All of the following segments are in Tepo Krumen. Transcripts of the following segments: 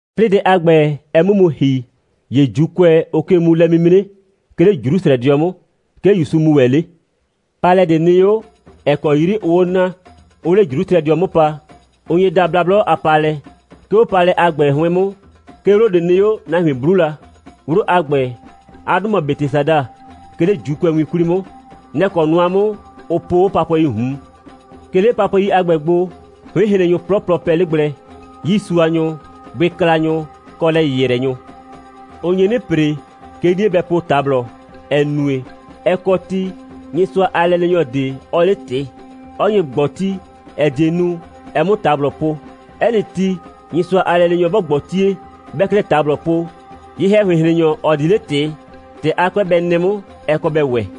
'Plɩɩ dɛ a ‑gbɛ, ɛ 'mʋ mu ‑hi, ‑ye ‑Juukʋɛ, ʋʋ ke mu lɛ'mimre, 'ke 'le Jrusrɛdɩɔ 'mʋ. 'Ke ‑Yusu mu ‑wɛ 'le. Paalɛ ꞊de nɩ 'o, ‑ɛ kɔ 'yri ʋʋ 'o naa, 'ʋʋ 'le Jrusrɛdɩɔ 'mʋ pa. Ʋ nye daa Blablɔ a Paalɛ. 'Ke 'o paalɛ a ‑gbɛ 'hʋɩn 'mʋ, 'ke 'wlo ꞊de nɩ 'o, nahuin 'blu la. 'Wlo a ‑gbɛ, 'a 'dʋ mɔ Betesada, 'ke 'le ‑Juukʋɛwin 'kwli 'mʋ. Nɛ‑ kɔ nʋa 'mʋ, ʋ poo 'o papʋɛii ꞊hun. 'Ke 'le papʋɛi a ‑gbɛ gbo, 'hʋɩnhrennyʋ 'plɔplɔ pɛ 'le gblɛ, 'yiisuanyʋ, bʋɩklanyʋ, kɔ lɛ‑yɩyrɛnyʋ. [Ʋ nye 'nɩ ‑pre, 'ke 'nie bɛ po ꞊tablɔ, ‑ɛ nue, ɛ kɔ ti, Nyɩsʋa a lɛleenyɔ ꞊de, 'ɔɔ 'le ꞊tɩ, 'ɔ nye ꞊gbɔti, ‑ɛ die nu, ɛ 'mʋ ꞊tablɔ po. 'Ɛ nɩ ti, Nyɩsʋa a lɛleenyɔ 'bɔ ꞊gbɔtie, 'bɛɛ 'klɛɛ ꞊tablɔ po, ye‑hɛhʋɩnhrennyɔ, ‑ɔ di 'le ꞊tɩ, ‑tɛ 'a 'kʋɛ bɛ nɩ 'mʋ, ɛ kɔ bɛ ‑wɛ.]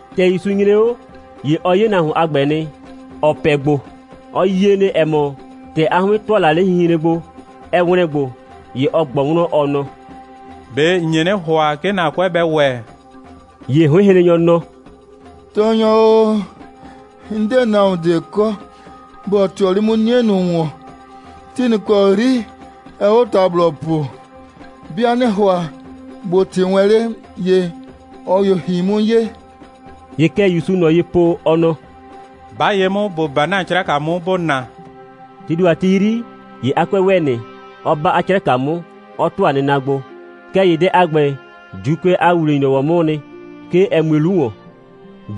‑Tɛ ‑Yusu nyre 'o, ‑ye ɔ 'ye nahuon a ‑gbɛ nɩ, ‑ɔ pɛ gbo. Ɔ yie nɩ, ‑ɛ mɔ, ‑tɛ 'a 'hʋɩn ‑tʋa la 'le hinhren gbo, ɛ ‑wlɛn gbo. ‑Ye ɔ ꞊gbɔ wlɔn, ɔ nɔ: «꞊Be ‑n nye 'nɩ ‑hʋa, 'ke ‑na 'kʋɛ bɛ ‑wɛ?» ‑Ye 'hʋɩnhrennyɔ nɔ: «Tɔɔnyɔ o, 'n 'de nahuon ꞊de kɔ, ‑bɔ ꞊tɩɔ 'le 'mʋ 'nie ‑wɔn, ti ꞊nʋ ‑kɔ 'yri ɛɛ 'o ꞊tablɔ po. 'Bɩa 'nɩ ‑hʋa ꞊bo ꞊tɩ wɛn 'le, ‑ye ꞊ɔ ‑ye ‑hi 'mʋ ye.» ‑Ye kɛ ‑Yusuu ꞊nɔ ye po, ɔ nɔ: «'Ba ye 'mʋ, ‑bo 'ba ‑na 'craka 'mʋ, ‑bo na!» Tii ‑do a ti 'yri, ‑ye 'a 'kʋɛ ‑wɛ nɩ, 'ɔ 'ba 'a 'craka 'mʋ, 'ɔ ‑tʋa nɩna gbo. Kɛɛ ‑ye dɛ a ‑gbɛ, ‑Juukʋɛ a ‑wuwle‑nyrɔwɔ 'mʋʋ nɩ, 'ke ɛ mue 'lu ‑wɔn.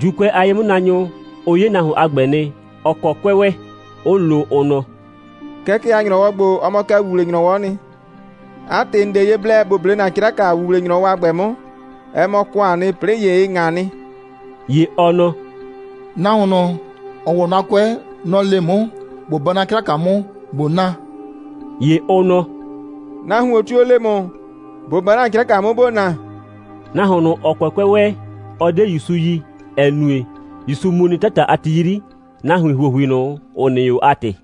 ‑Juukʋɛ a ye'mʋnaanyʋ, ʋ 'ye nahuon a ‑gbɛ nɩ, ‑ɔ kɔ 'kʋɛ ‑wɛ, 'ʋ lo, ʋ nɔ: «Kɛkɛ a ‑nyrɔwɔ ‑gbo, ɔ mɔ kɛ ‑wuwle‑nyrɔwɔ'ɔ nɩ. 'A ‑tɩ, ‑n 'de ye blɛ ‑bo 'ble ‑na 'craka ‑wuwle‑nyrɔwɔ a ‑gbɛ 'mʋ. Ɛ mɔ ‑kʋaan nɩ, 'plɩɩ ‑ye ɩ ꞊ŋa nɩ.» ‑Ye ɔ nɔ: «Nahuon ꞊nʋ, ‑ɔ ‑wɔ 'na 'kʋɛ, nɔ‑ le 'mʋ, ꞊bo 'ba 'na 'craka 'mʋ, ꞊bo na.» ‑Ye ʋ nɔ: «Nahuon tio‑ le ‑mʋ, ‑bo 'ba ‑na 'craka 'mʋ, ‑bo na?» Nahuon ꞊nʋ, ‑ɔ kɔ 'kʋɛ ‑wɛ, ɔ 'de ‑Yusu yi, ‑ɛ nue, ‑Yusu mu nɩ 'tata a ti 'yri, nahuin ‑huohui ꞊nʋ, ‑ʋ nɩ 'o a ‑tɩ.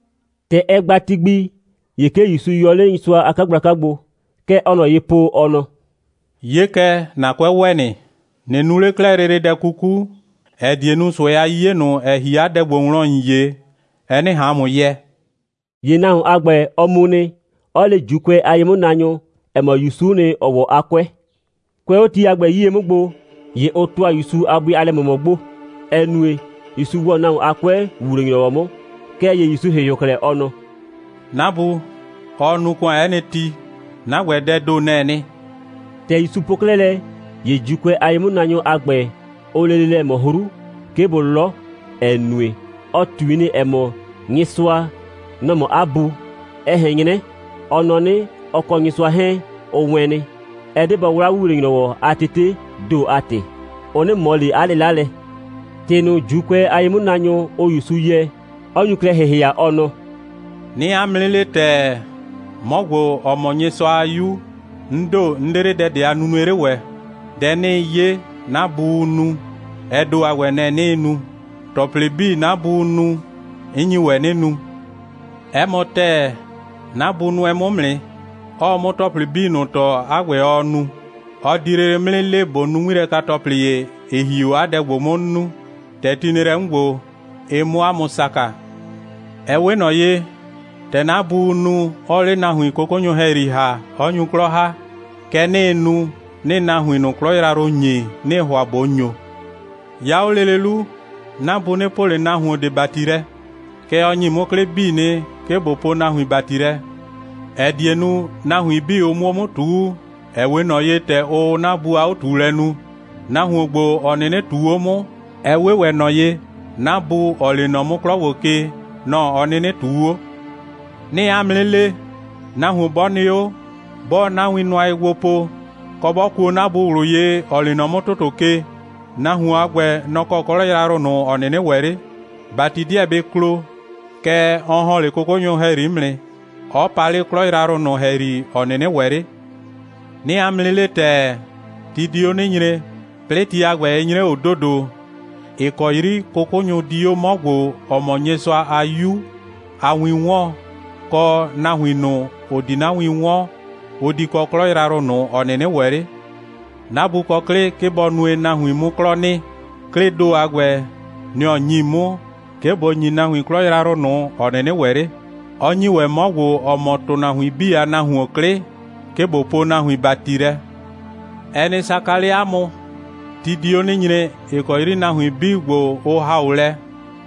‑Tɛ ɛ gba ti gbi, ‑ye 'ke ‑Yusu yɔ 'le Nyɩsʋa a 'kagblaka gbo. Kɛ ɔɔ ꞊nɔ ye po, ɔ nɔ: «'Ye kɛ, ‑na 'kʋɛ ‑wɛ nɩ. ꞊Nɩ nu 'le 'klɛɛ lele dɛ 'kuku, ‑ɛ die nu, ꞊sʋɛ a 'yiye ꞊nʋ, ‑ɛ ‑hi 'a dɛ ‑gbo wlɔn, ‑n 'ye, ɛ 'nɩ ꞊han ‑mʋ yɛ.» ‑Ye nahuon a ‑gbɛ, ɔ mu nɩ, 'ɔ le ‑Juukʋɛ a ye'mʋnaanyʋ, ‑ɛ mɔ, ‑Yusu'u nɩ, ‑ɔ ‑wɔ 'a 'kʋɛ. Kʋɛ 'o ti a ‑gbɛ 'yie 'mʋ gbo, ‑ye ʋ ‑tʋa ‑Yusu a bʋɩ a lɛ꞊mʋmɔ gbo, ‑ɛ nue, ‑Yusu ‑wɔ nahuon a 'kʋɛ, ‑wuwle‑nyrɔwɔ 'mʋ. Kɛɛ ‑ye ‑Yusu ‑hɩhɩʋ klɛ, ɔ nɔ: «'Na Bu, ɔɔ nu ‑kʋan 'ɛ nɩ ti. 'Na ‑gbɛ, dɛɛ ‑do, nɛ‑ɛ nɩ.» ‑Tɛ ‑Yusu po 'klɛɛ lɛ, ‑ye ‑Juukʋɛ a ye'mʋnaanyʋ a ‑gbɛ, ʋʋ lele lɛ ꞊mɔ 'hru, 'ke bʋ 'lɔ, ‑ɛ nue, ɔ ꞊tui nɩ, ‑ɛ mɔ, Nyɩsʋa, nɔ‑ mɔ 'a Bu, ɛ ꞊hɛn 'nyrɛ, ɔ nɔ 'nɩ, ɔ kɔ Nyɩsʋa 'hɛɛn, ʋ wɛɛn nɩ. Ɛ 'de bɔ 'wla ‑wuwle‑nyrɔwɔ a tetee ‑do a ‑tɩ, ʋ 'nɩ ꞊mɔ ꞊le 'a 'lɩla lɛ. ‑Tɩ ꞊nʋ, ‑Juukʋɛ a ye'mʋnaanyʋ, ʋʋ ‑Yusu yɛɛ, 'ɔ nyu klɛ ‑hɩhɩa, ɔ nɔ: «'Nɩɩ 'a mʋ 'nɩ le ‑tɛɛ, 'mɔ ‑gbo, ‑ɔ mɔ Nyɩsʋa a 'Yu, 'n ‑do, 'n 'de 'le dɛ ꞊de a nunue 'le ‑wɛ. Dɛ 'nɩɩ 'ye, 'na Buu nu, ɛ ‑do a ‑gbɛ, nɛ‑ 'nɩɩ nu. ‑Tɔplɩ 'bii, 'na Buu nu, 'n nyi ‑wɛ 'nɩ nu. 'Ɛ mɔ ‑tɛɛ, 'na Bu nʋɛ 'mʋ 'mʋ nɩ, 'ɔɔ 'mʋ ‑tɔplɩ 'bii ꞊nʋ tɔɔ, 'a ‑gbɛ, ɔɔ nu. Ɔ di lele 'mʋ 'nɩ le, ꞊bo nu 'ŋmilɛka‑tɔplɩ ‑ye, ‑ɩ ‑hi 'o 'a dɛ ‑gbo 'mʋ, 'n nu, ‑tɛ ti nɩ lɛ 'mʋ ‑gbo, ɩ 'mʋ 'a mʋ saka. Ɛ 'we ꞊nɔ ye, ‑tɛ 'na Buu nu, 'ɔɔ 'le nahuin 'kʋkʋnyʋ ‑hɛyri ‑ha, 'ɔ nyu 'klɔ ‑ha, kɛ 'nɩɩ nu, 'nɩɩ nahuin ꞊nʋ 'klɔ yrayrʋ ‑nyi, 'nɩɩ ‑hʋa ꞊bo ‑nyo. 'Ya 'o lele 'lu, 'na Bu 'nɩ poo ꞊le nahuon ꞊de ‑bati lɛ, kɛɛ, ɔ ‑nyi 'mʋ 'klɩ 'bii nɩ, 'ke ꞊bo poo nahuin ‑bati lɛ, ‑ɛ die nu, nahuin 'bii, ʋ 'mʋ 'mʋ 'o ꞊tuu, ‑ɛ 'we ꞊nɔ ye, ‑tɛ ʋʋ 'na Bu a 'o꞊tuulɛ nu. Nahuon ‑gbo, ‑ɔ 'nɩnɩ ꞊tuu 'o 'mʋ, ɛ 'we ‑wɛ ꞊nɔ ye, 'na Bu, ‑ɔ lee nɔ 'mʋ 'klɔ ‑gbo ke, nɔ‑ ɔ 'nɩnɩ ꞊tuu 'o. 'Nɩɩ 'a mʋ 'nɩ le, nahuon 'bɔ nɩ 'o, 'bɔɔ 'na win nʋa ye gbo po, kɔ, 'bɔ kuo 'na Bu ꞊wlʋ ye, ‑ɔ lee nɔ 'mʋ ‑tʋtʋ ke, nahuon a ‑gbɛ, nɔ‑ kɔ 'klɔ yrayrʋ ꞊nʋ, ‑ɔ 'nɩnɩ ‑wɛ 'le. ‑Bati 'deɛ bɩ klo, kɛɛ, ɔ ‑hɔn 'le 'kʋkʋɛ wlɔn 'mʋ nɩ, 'ɔ pa 'le 'klɔ yrayrʋ ꞊nʋ ‑hɛyri, ‑ɔ 'nɩnɩ ‑wɛ 'le. 'Nɩɩ 'a mʋ 'nɩ le ‑tɛɛ, ti di 'o 'nɩ nyre, 'plɩɩ ti a ‑gbɛ 'ɩ nyre 'o ‑dodo, ‑ɩ kɔ 'yri 'kʋkʋnyʋ di 'o 'mɔ ‑gbo, ‑ɔ mɔ Nyɩsʋa a 'Yu a win 'wɔɔn, kɔ, nahuin ꞊nʋ, ‑ʋ di 'na win 'wɔn, ʋ di kɔ 'klɔ yrayrʋ ꞊nʋ, ‑ɔ 'nɩnɩ ‑wɛ 'le. 'Na Bu kɔ 'klɩ, 'ke bɔ nue, nahuin 'mʋ 'klɔ nɩ. 'Klɩɩ ‑do a ‑gbɛ, nɩ‑ ɔ ‑nyi 'mʋ, 'ke ꞊bo ‑nyi nahuin 'klɔ yrayrʋ ꞊nʋ, ‑ɔ 'nɩnɩ ‑wɛ 'le, 'ɔ ‑nyi ‑wɛ 'mɔ ‑gbo, ‑ɔ mɔ ‑tʋnahuin 'bii a Nahuon 'klɩ, 'ke ꞊bo poo nahuin ‑bati lɛ. Ɛ nɩ saka 'le 'a mʋ, ti di 'o 'nɩ nyre, ‑ɩ kɔ 'yri nahuin 'bii ‑gbo, ʋ ‑ha 'o lɛ,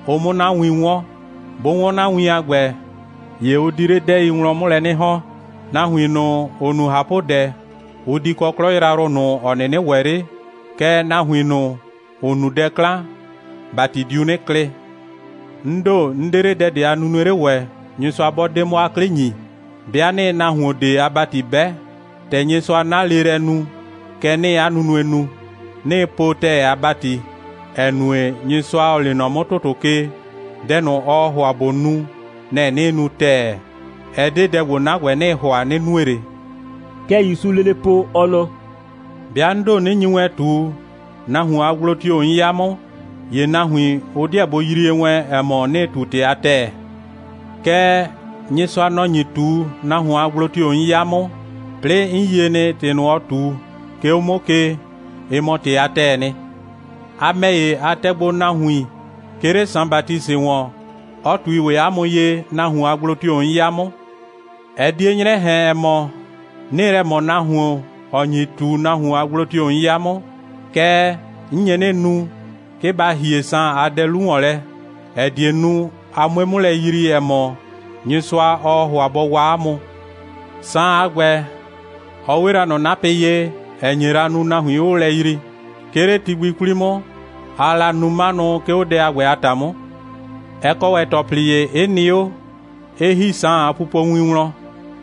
ʋ 'mʋ 'na win 'wɔn. 'Bʋ 'wɔn 'na win a ‑gbɛ, ‑ye ʋ di 'le 'dɛɛi wlɔn 'mʋ lɛ 'nɩ ‑hɔn. Nahuin ꞊nʋ, ‑ʋ nu ꞊hapʋdɛ, ʋ di kɔ 'klɔ yrayrʋ ꞊nʋ, ‑ɔ 'nɩnɩ ‑wɛ 'le, kɛɛ, nahuin ꞊nʋ, ‑ʋ nu dɛ 'klan, ‑bati diu 'nɩ klɩ. 'N ‑do, 'n 'de 'le dɛ ꞊de a nunue 'le ‑wɛ, Nyɩsʋa 'bɔ 'de 'mʋ 'a 'klɩ ‑nyi. 'Bɩa 'nɩɩ nahuon ꞊de a ‑bati 'bɛ, ‑tɛ Nyɩsʋa 'na leelɛ nu, kɛ 'nɩɩ 'a nunue nu. 'Nɩɩ po ‑tɛɛ a ‑bati, ‑ɛ nue, Nyɩsʋa, ‑ɔ lee nɔ 'mʋ ‑tʋtʋ ke, dɛ ꞊nʋ, ɔɔ ‑hʋa ꞊bo nu, nɛ‑ 'nɩɩ nu ‑tɛɛ. Ɛ 'de dɛ ‑gbo, 'na ‑gbɛ, 'nɩɩ ‑hʋa, 'nɩ nue ꞊le.» Kɛ ‑Yusuu lele po, ɔ nɔ: «'Bɩa 'n ‑do, 'nɩ nyi wɛn ꞊tu, nahuon a gblo tio‑ 'n 'ya 'mʋ, ‑ye nahuin, ʋ 'deɛ bʋ yrie wɛn, ‑ɛ mɔ, 'nɩɩ ꞊tu ‑tɩ a ‑tɛɛ. Kɛɛ, Nyɩsʋa, nɔ‑ nyi ꞊tu, nahuon a gblo tio‑ 'n 'ya 'mʋ, 'plɩɩ 'n yie nɩ, ‑tɩ ꞊nʋ, ɔɔ ꞊tu, 'ke 'o 'mʋ ke, ɩ mɔ ‑tɩ a ‑tɛɛ nɩ. A ‑mɛ ‑ye, a tɛ gbo nahuin, 'ke 'le Saan Batisɩ ‑wɔn, 'ɔ ꞊tui ‑wɛ 'a mʋ ye, nahuon a gblo tio‑ 'n 'ya 'mʋ. Ɛ 'die 'nyrɛ ꞊hɛn, ‑ɛ mɔ, 'nɩɩ lɛ ꞊mɔ nahuon, ‑ɔ nyi ꞊tu, nahuon a gblo tio‑ 'n 'ya 'mʋ. Kɛɛ, 'n nye 'nɩ nu, 'ke ba ‑hie Saan a dɛ 'lu ‑wɔn lɛ, ‑ɛ die nu, a 'mue 'mʋ lɛ yrii, ‑ɛ mɔ, Nyɩsʋa, ɔɔ ‑hʋa bɔ waa 'a mʋ. Saan a ‑gbɛ, ɔ 'we la ꞊nɔ 'napɩ ye, ‑ɛ nye la nu, nahuin 'ʋʋ lɛ yrii. 'Ke 'le ti gbi 'kwli 'mʋ, aa la nu 'manʋ, 'ke 'o dɛ a ‑gbɛ a ‑ta 'mʋ. Ɛ kɔ ‑wɛ ‑tɔplɩ ‑ye, 'ɩ nɩ 'o, 'ɩ ‑hi Saan a pupowin wlɔn.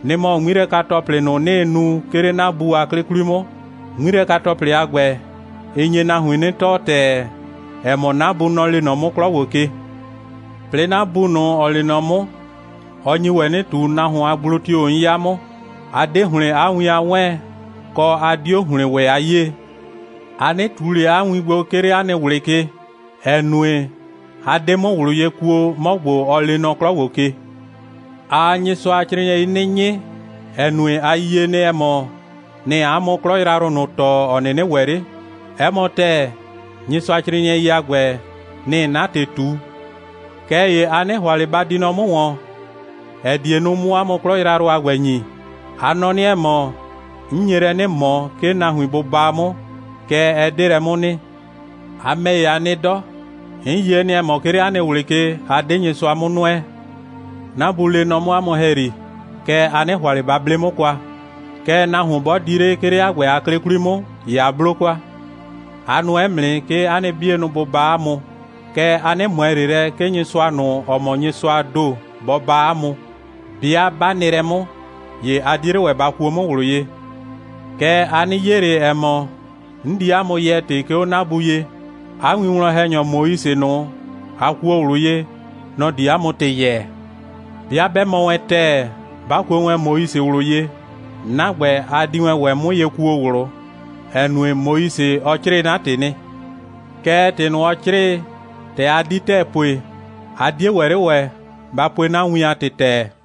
Nɩ‑ mɔ 'ŋmilɛka‑tɔplɩ ꞊nʋ, 'nɩɩ nu, 'ke 'le 'na Bu a 'klɩ 'kwli 'mʋ. 'Ŋmilɛka‑tɔplɩ a ‑gbɛ, ɩ nye nahuin 'nɩ tɔɔ ‑tɛɛ, ‑ɛ mɔ, 'na Bu, nɔ‑ lee nɔ 'mʋ 'klɔ ‑gbo ke. 'Plɩɩ 'na Bu ꞊nʋ, ‑ɔɔ lee nɔ 'mʋ, ɔ nyi ‑wɛ 'nɩ ꞊tu, nahuon a gblo tio‑ 'n 'ya 'mʋ. A 'de ‑hlɩn 'a win a 'wɛɛn, kɔ, a 'dio ‑hlɩn ‑wɛ a 'yee. A 'nɩ ꞊tu ꞊le 'a win gbo, 'ke 'le 'a nɩ ꞊wlɩ ke, ‑ɛ nue, a 'de 'mʋ ꞊wlʋ ye kuo, 'mɔ ‑gbo, ɔ lee nɔ 'klɔ ‑gbo ke. Aa Nyɩsʋacrɩɩnɩɛi 'nɩ 'nyɩ, ‑ɛ nue, a yie nɩ, ‑ɛ mɔ, nɩ‑ɩ 'a mʋ 'klɔ yrayrʋ ꞊nʋ tɔɔ, ‑ɔ 'nɩnɩ ‑wɛ 'le. 'Ɛ mɔ ‑tɛɛ, Nyɩsʋacrɩɩnɩɛi a ‑gbɛ, nɩ‑ɩ 'na ‑tɩ ꞊tu. Kɛɛ ‑ye a 'nɩ ‑hʋa ꞊le ba di nɔ 'mʋ ‑wɔn, ‑ɛ die nu, 'mʋ 'a mʋ 'klɔ yrayrʋ a ‑gbɛ ‑nyi. A nɔ 'nɩ, ‑ɛ mɔ, 'n nye lɛ 'nɩ ꞊mɔ, 'ke nahuin bʋ baa 'mʋ. Kɛɛ, ɛ 'de lɛ 'mʋ nɩ. A ‑mɛ ‑ye, a nɩ 'dɔ. 'N yie nɩ, ‑ɛ mɔ, 'ke 'le 'a nɩ ꞊wlɩ ke, a 'de Nyɩsʋa 'mʋ nʋɛ. 'Na Bu lee nɔ 'mʋ 'a mʋ ‑hɛyri, kɛɛ, a 'nɩ ‑hʋa ꞊le ba 'ble 'mʋ kwa. Kɛɛ, nahuon 'bɔ di 'le, 'ke 'le 'a ‑gbɛ a 'klɩ 'kwli 'mʋ, ‑ye a 'blo kwa. A nʋɛ 'mʋ nɩ, 'ke 'a nɩ 'bienʋ bʋ baa 'a mʋ. Kɛɛ, a 'nɩ ꞊mʋɛ ꞊le lɛ, 'ke Nyɩsʋa ꞊nʋ, ‑ɔ mɔ Nyɩsʋaa ‑do, bɔ baa 'a mʋ. 'Bɩa 'ba nɩ lɛ 'mʋ, ‑ye a 'die 'le ‑wɛ ba kuo 'mʋ ꞊wlʋ ye. Kɛɛ, a nɩ 'ye 'le, ‑ɛ mɔ, 'n di 'a mʋ yɛɛ ‑tɩ, 'ke 'o 'na Bu ye. 'A winwlɔn‑hɛnyɔ Moise ꞊nʋ, a kuo ꞊wlʋ ye, nɔ‑ di 'a mʋ ‑tɩ yɛɛ. 'Bɩa 'bɛ mɔ wɛn ‑tɛɛ, 'ba kuo wɛn Moise ꞊wlʋ ye, 'na ‑gbɛ, a di wɛn ‑wɛ 'mʋ ye kuo ꞊wlʋ, ‑ɛ nue, Moise, ɔ 'crɩɩ 'na ‑tɩ nɩ. Kɛɛ, ‑tɩ ꞊nʋ, ɔ 'crɩɩ, ‑tɛ a 'di ‑tɛɛ pue, a 'die ‑wɛ 'le ‑wɛ, ba pue 'na win a ‑tɩ ‑tɛɛ.»